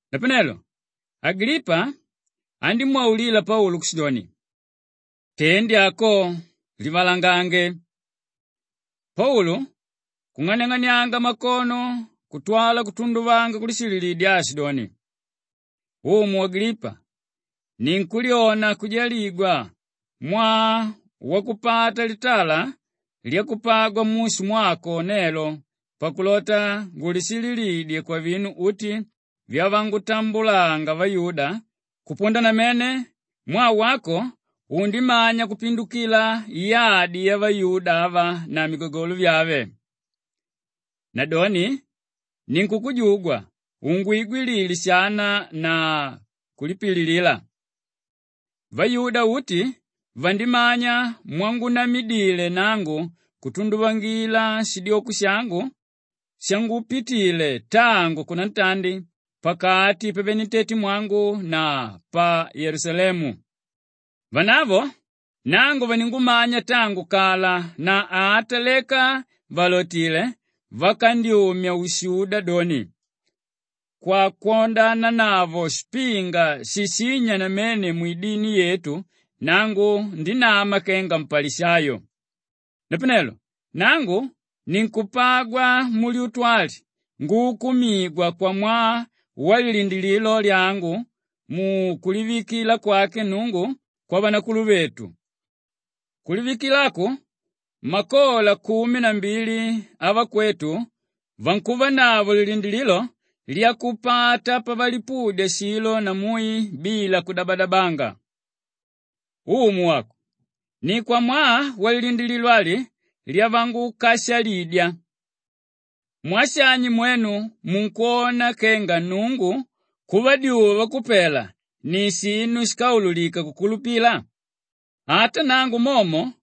Napanelo Agilipa andímwaulila Paulu kushidoni, “Tendi ako livalangange!” Paulu kung'aniang'anianga makono kutwala kutunduvanga kulishililidya aashidoni, “Umu Agilipa, ninkulyona kujaligwa mwaa wakupata litala lyakupagwa mushu mwako nelo pakulota ngulishililidye kwavinu uti vyavangutambulanga vayuda kupunda namene mwaa wako undimanya kupindukila yadi yavayuda ava na migagolo vyave. Nadoni ninkukujugwa ungwigwilile shana na kulipililila. “Vayuda uti vandimanya mwangunamidile nangu kutunduvangila shidyoko shangu shangupitile tangu kunantandi pakati pavenentetemwangu na pa Yelusalemu. Vanavo nangu vaningumanya tangu kala na ata leka vàlotile, vakandyumya ushuda doni kwakwodananavo shipinga shishínya namene mwidini yetu nangu ndinama kenga mpalishayo. Napanelo nangu ninkupagwa mulyutu ali nguukumigwa kwamwaa walilindilililo lyangu mukulivikila kwake Nnungu kwavanakuluvetu, kulivikila aku makola kumi na mbili avakwetu vankuvanavo lilindilililo lyakupata pavalipudya shilo na mui bila kudabadabanga. Umu wako, ni kwamwaa walilindilililo ali lyavangukashalidya! Mwaa shani mwenu munkwona kenga Nnungu kuvadyuwa vakupela ni shinu shíkaululika kukulupila? Ata nangu momo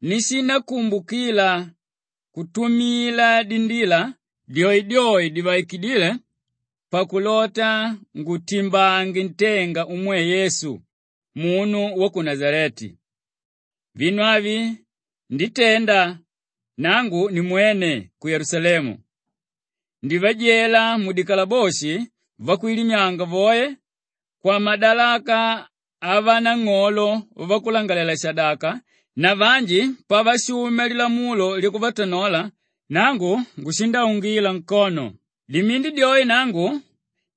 nishindakumbukila kutumila dindila dyoedyoe divaikidíle pakulota ngutimbange ntenga umwe Yesu, munu wa ku Nashaleti. Vinu avi nditenda nangu nimwene ku Yelusalemu. Ndivajela mudikalaboshi vakwilimyanga voe kwamadalaka avanang'olo vavakulangalalela-shadaka na vanji pavashumya lilamulo lyakuvatanola, nangu ngushindaungila nkono. Dimindi dyoe nangu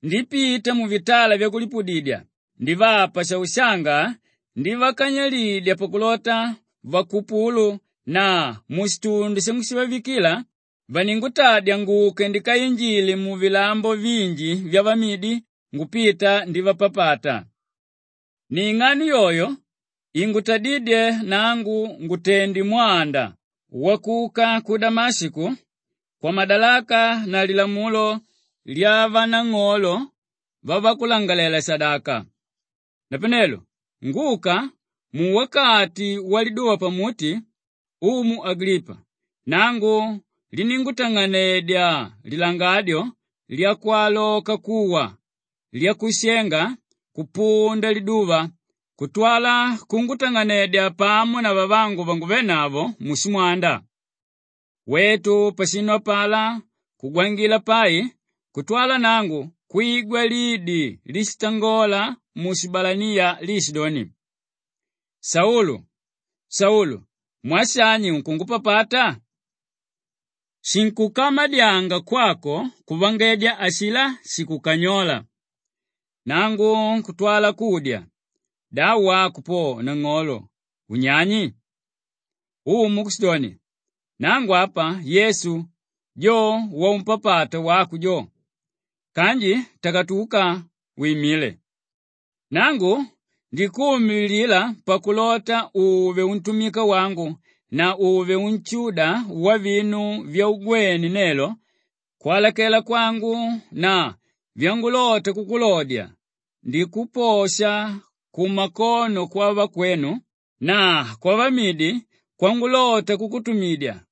ndipita muvitala vyakulipudidya ndivapa shaushanga ndivakanyilidya pakulota vakupulu na mushitundi shangushivavikila, vaningutadya nguke ndikainjile muvilambo vinji vyavamidi ngupita ndivapapata. “Ni ing'ano yoyo ingutadídye nangu ngutende mwanda wakuka ku Damashiko kwamadalaka na lilamulo lyavanang'olo vavakulangalalela-shadaka. Napanelo nguka, muwakati waliduva pamuti, Umu Agilipa, nangu liníngutang'anedya lilangadyo lyakwaloka kuwa, lyakushenga kupunda liduva kutwala kungutang'anedya pamo na vavangu vanguvénavo mushimwanda. Wetu pashinu apalá kugwangila pai kutwala nangu kwigwa lidi líshitangola mushibalaniya liishidoni, ‘Saulu, Saulu, mwaa shani unkungupapata? Shinkukamadyanga kwako kuvangedya ashilá shikukanyóla.’ Nangu kutwala kudya, ‘Da wako po nang'olo unyani?’ Umu kushidoni, ‘Nangu apa Yesu, jo waumpapata wako jo. Kanji takatuka wimile. Nangu ndikuumililila pakulota uve untumika wangu na uve unshuda wavinu vyaugwene nelo kwalakela kwangu na vyangulota kukulodya ndikuposha kumakono kwavakwenu na kwavamidi kwangulota kukutumidya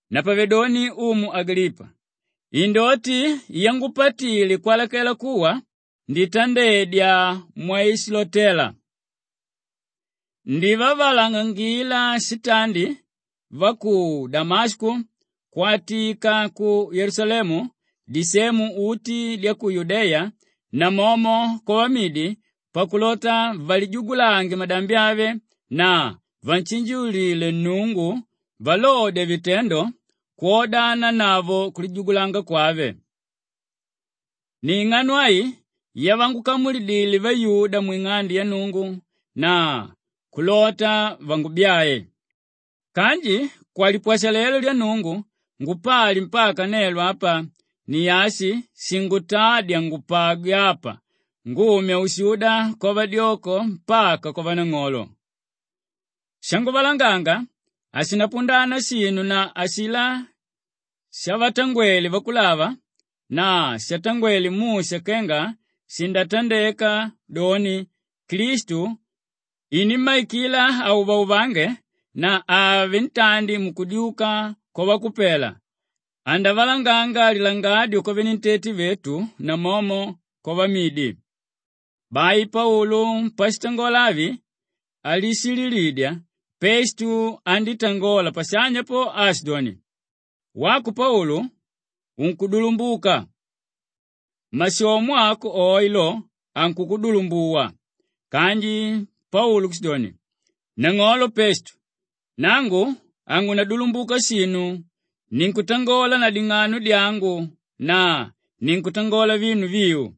“Napavedoni Umu Agilipa, indoti yangupatile kwalakela kuwa, nditandedya mwaishilotéla. Ndivavalangangila shitandi va ku Damashiko, kwatika ku Yelusalemu, disemu uti dya ku Yudeya namomo kwavamidi pakulota valijugulange madambi ave na vanshinjiulile Nnungu valodya vitendo kwodananavo kulijugulanga kwave. Ni ing'ano ai yavangukamulidile vayuda mwing'ande ya Nnungu na kulota vangubyae. Kanji kwalipwashalelo lya Nnungu ngupali mpaka nelo apa; ni ashi shingutádya ngupagwe apa ngumya ushuda kwavadyoko mpaka kwavanang'olo. Shanguvalanganga hashinapundana shinu na ashilá shavatangwele vakulava na shatangwele Musha kenga shindatandeka, doni, Klistu inimmaikila auvauvange na àvele ntandi mukudyuka kwavakupela, andavalanganga lilangadyo kwavenentete vetu namomo kwavamidi.” Bai Paulu pashitangola avi alishililidya, Pestu andítangola pashanya po aashidoni, “Wako Paulu unkudulumbuka! Mashomo ako oe lo, ankukudulumbuwa.” Kanji Paulu kushidoni, “Nang'olo Pestu, nangu hangunadulumbuka shinu; ninkutangola na ding'ano dyangu na ninkutangola vinu viu.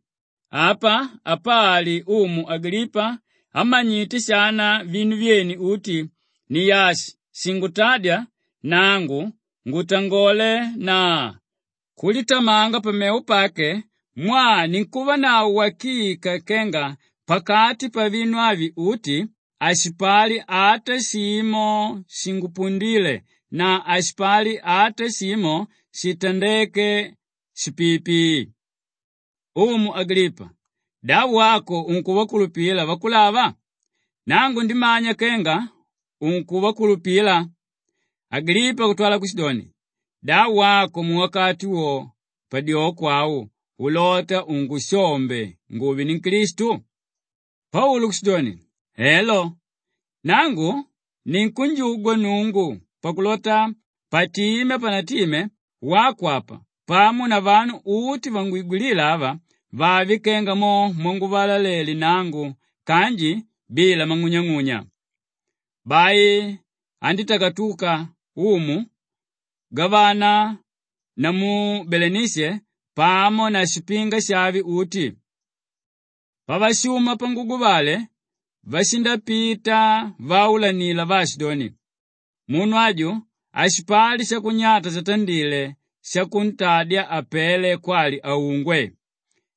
Apa apali umu Agilipa ámanyite shana vinu vyene uti; ni ashi shingutádya nangu ngutangole na kulitamanga pamevo pake mwaa ninkuvanavo wakika kenga pakati pavinu avi uti hashipali ata shimo shimpundíle na hashipali ata shimo shitandéke shipiipii. Umu Agilipa, da wako unkuvakulupila vakulava? Nangu ndimanya kenga unkuvakulupila.” Agilipa kutwala kushidoni, “Da wako muwakati wo padyoko au ulota ungushombe nguve ninklistu!” Paulu kushidoni, “Elo, nangu ninkunjugwa Nnungu pakulota patime hapanatime wako apa pamo na vanu uti vangwigwilíla ava vave kenga mo mwanguvalalele nangu kanji bila mang'unyang'unya.” Bai andítakatuka umu, gavana namu Belenishe pamo na shipinga shave uti. Pavashuma panguguvale, vashindapita vaulanila vaashidoni, “Munu aju hashipali shakunyata shatandile shakuntadya apele kwali aungwe.”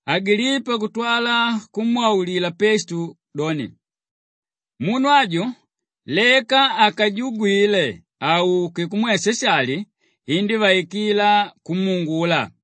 Agilipa kutwala kumwaulila Pestu doni, “Munu aju leka akajugwile auke kumwe Shashali, indívaikila kumuungula.”